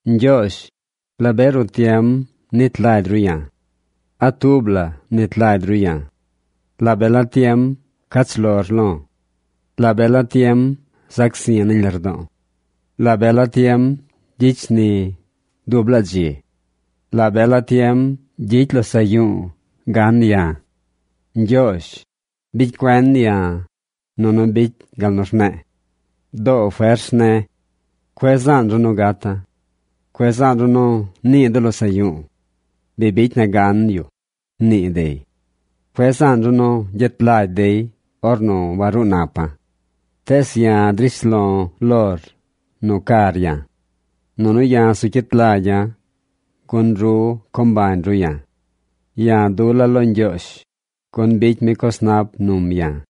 Ñgyoozh, ¿la be ruꞌ tiem nit lagy ru ya̱? ¿A tub la mnit lagy ru ya̱? ¿La be la tiem cach lor lo̱? ¿La be la tiem zac zi̱ nañ lardo̱o̱? ¿La be la tiem gyicy shni dub laa dzi? ¿La be la tiem gyicy losaꞌ yu̱u̱ gan ya̱? Ñgyoozh, ¡bicy cuen ya̱, nunu bicy gal nu rne̱e̱! ¡Doo fers ne̱! ¡Cueꞌ zaan ru nu gata̱! ¡Cueꞌ zaan ru nu nii de losaꞌ yu̱u̱: “Bi bicy na gan yu”, nii dey! ¡Cueꞌ zaan ru nu gyet lagy dey ornu waruu napa̱! Tees ya̱ drish lo̱ lor nu car ya̱. Nunu ya̱ zu cyit lagya̱ gun ru co mbañ ru ya̱. ¡Ya̱ dula̱ lo Ñgyoozh, gun bicy mi coz nap num ya̱!